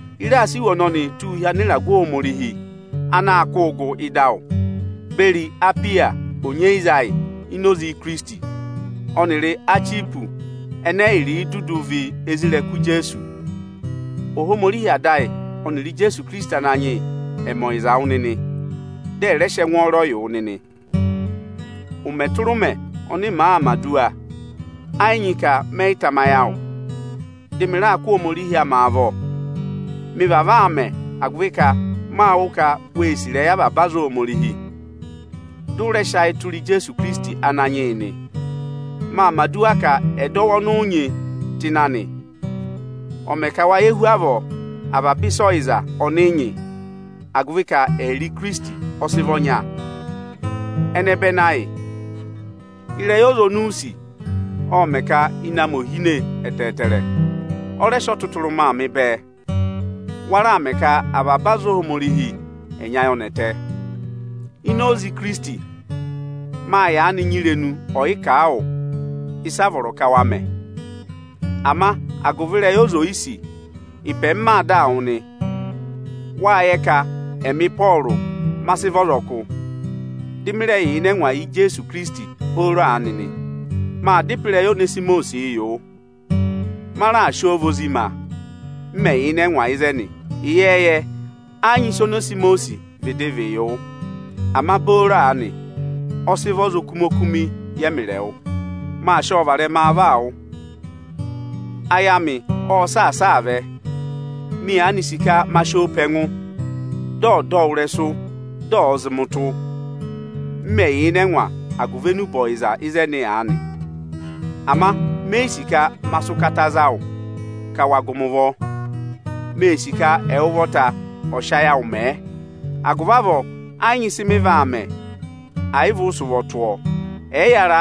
Ị raa sị iwe ọnọnịị tụ́ụ hi anịragụ anaā kụụ gụ ịdị awụ, beri Apiya onyeyiza ayị ini Ikirisiti, ọnịrị Achipọsị ẹnẹ ẹyịrị dudu vị isoja Ijeesu. Ohomorihi Ada ayị ọnịrị Ijeesu Ikirisiti Ananyị yị ẹ̀ mẹ ọyịza wụ nịnị, dị ẹ rẹ mẹ ẹngwọọrọ yị wụ nịnị. Ụmẹ tụra ụmẹ ọnị màa mẹ̀ aduwa, ẹ yị nyị ka mẹyị tamayị awụ, dị mị raa kụ́ Ohomorihi amị avọ. Mị vavọọ aa mẹ, agụvị ka máa wụ́ ka wee sì ịrẹyị aza Ohomorihi, dị ụ rẹ sị ayị tụra Ijeesu Ikirisiti Ananyị yị nị. Maa mẹ̀ aduwa ka ẹdọwụ ọnị ụ nyị tụ ịnị anị, ọ̀ va mẹ ka wa yẹ avaba ịsa ọyịza ọnị nyị hu avọọ, agụvị ka ẹyịrị Ikirisiti ọ sị vị ọnya. Ẹnẹbẹnị, ịrẹyị ọza ọnị u sì, ộ mẹ̀ ka ịnẹ amị ò hine ẹtẹẹtẹrẹ, ộ rẹ sị ọtụtụrụma mị bẹẹ. Wa raà mẹ ka avaba aza Ohomorihi ẹ̀ nyị ayọnẹtẹ. Ini oze Ikirisiti, máa yaanị nyị irenu ọ̀yị kà a wụ, ịsị a vọrọ ka wa mẹ. Ama agụvị ka me sì ịrẹyị awụ, ịpẹ m maa dáa wụ nị. Wáa yẹ ka ẹmị Ịpọọrụ, ma sị vị ọzọkụ, dị mị rẹ yà ịnị ẹngwa agụvị Ijeesu Ikirisiti booro aanị nị. Maa dá ịpẹ ịrẹyị Onesimọsịị yị wụ. Ma raà sị ọ vị ozi ma m mẹ̀ yà ịnị ẹngwa ịzẹnị. Ịyẹẹyẹ, ẹ́ yị nyị ịsị Onesimọsị vịdị vị yị wụ; ama booro aanị, ọ sị vị ọza okumi-okumi yị ẹmịrị ẹwụ. Maa sị ọ varẹma vaa wụ̀, ayị amị ọ́ọ saasa aa vẹ. Mị yaanị sì ka ma sị ọ pe ẹngụ, dị ọ̀ dọ wụ ịrẹsụ, dị ọ̀ọ zị mị ụtụ, m mẹ yà ịnị ẹngwa agụvị enube ọyịza ịzẹnị aanị Ama mé yi sì ka ma sị ụkata za wụ gụ mị ụvọ. Mee sì ka ẹwụ ụvọta ọ̀ sị ayị awụ mẹẹ. Agụvị avọọ, ẹ́ yị nyị ịsị mị vaa mẹ ẹ̀ yị vị ụ sị ụvọ tụ́ ọ. Ẹyịyara,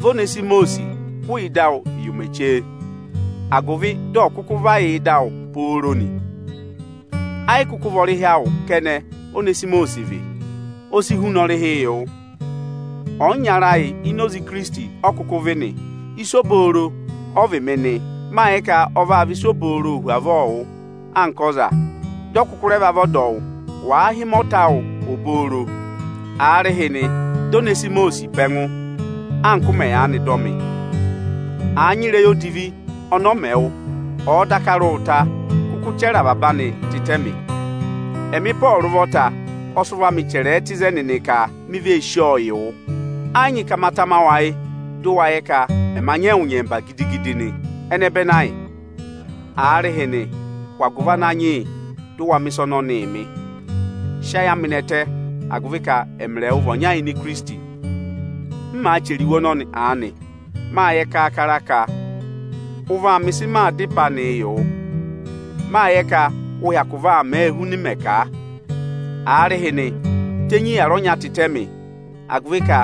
vị Onesimọsị hụụ ịdị awụ yị ụmẹ chee, agụvị dị ọ̀ kụkụ va yà ịdị awụ pooro nị. Ẹ́ yị kụkụ vị ọrịhị awụ kẹnẹ Onesimọsị vị, o si huna ọrịhị yị wụ. Ọyịnyara ayị ini Ikirisiti ọ kụkụ vị nị. Ịsa obooro ọ vị mị nị; máa yẹ ka ọ vaa vị ịsa obooro hu avọọ yị wụ anka ọza, dị ọ rẹ kụkụ va vị ọdọwụ bẹẹ. Wàa hị́ mị ọnọhụva awụ, aarịhịnị dọ Onesimọsị pe ẹngụ anka ụ mẹ yaanị dọ mị. Àa nyị ịrẹyị odivi ọnị ọ mẹ wụ, ọ̀ọ daka rị wụ ụta, kụkụ chẹrẹ avaba anị tịtẹ mị. Ẹmị Ịpọọrụ ụvọta ọ sị ụvọ amị chẹrẹ ẹ tụ́ ịzẹnị nị ka: Mị vee sí ọ yị wụ. Ẹ́ yị nyị ka ma tama wụ ayị, dụ wa yẹ ka ẹma nyị ẹwụ ụvọta ịnyẹmba nị. Ẹnẹbẹnị ayị, aarịhịnị hụ agụvị Ananyị yị dụ wa mẹ̀ ịsa ọnọnị mị. Sị ayị amị nẹtẹ agụvị ka ẹmịrị ẹwụ vị ọnya ini Ikirisiti. M màa chẹrẹ iwe ọnọnị aanị, maa yẹ kaakara ka ụ vaa mẹ ịsị maa dá ịpẹ anịị yị wụ. Máa yẹ ka ụ vaa mẹẹ huna m mẹ kà a. Aarịhịnị, tenyi aku ọnya tịtẹ mị, agụvị ka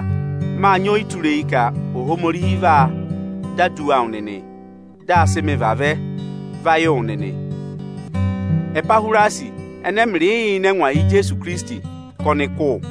máa nyị ọyịtureyi ka Ohomorihi vaa dọ aduwa awụ nịnị, dị a sị mị vavẹ va yị wụ nịnị. Epahwirasi ẹnẹ ẹmịrịị yà ịnị ẹngwa agụvị Ijeesu Ikirisiti ka ọnị kụ́ wụ.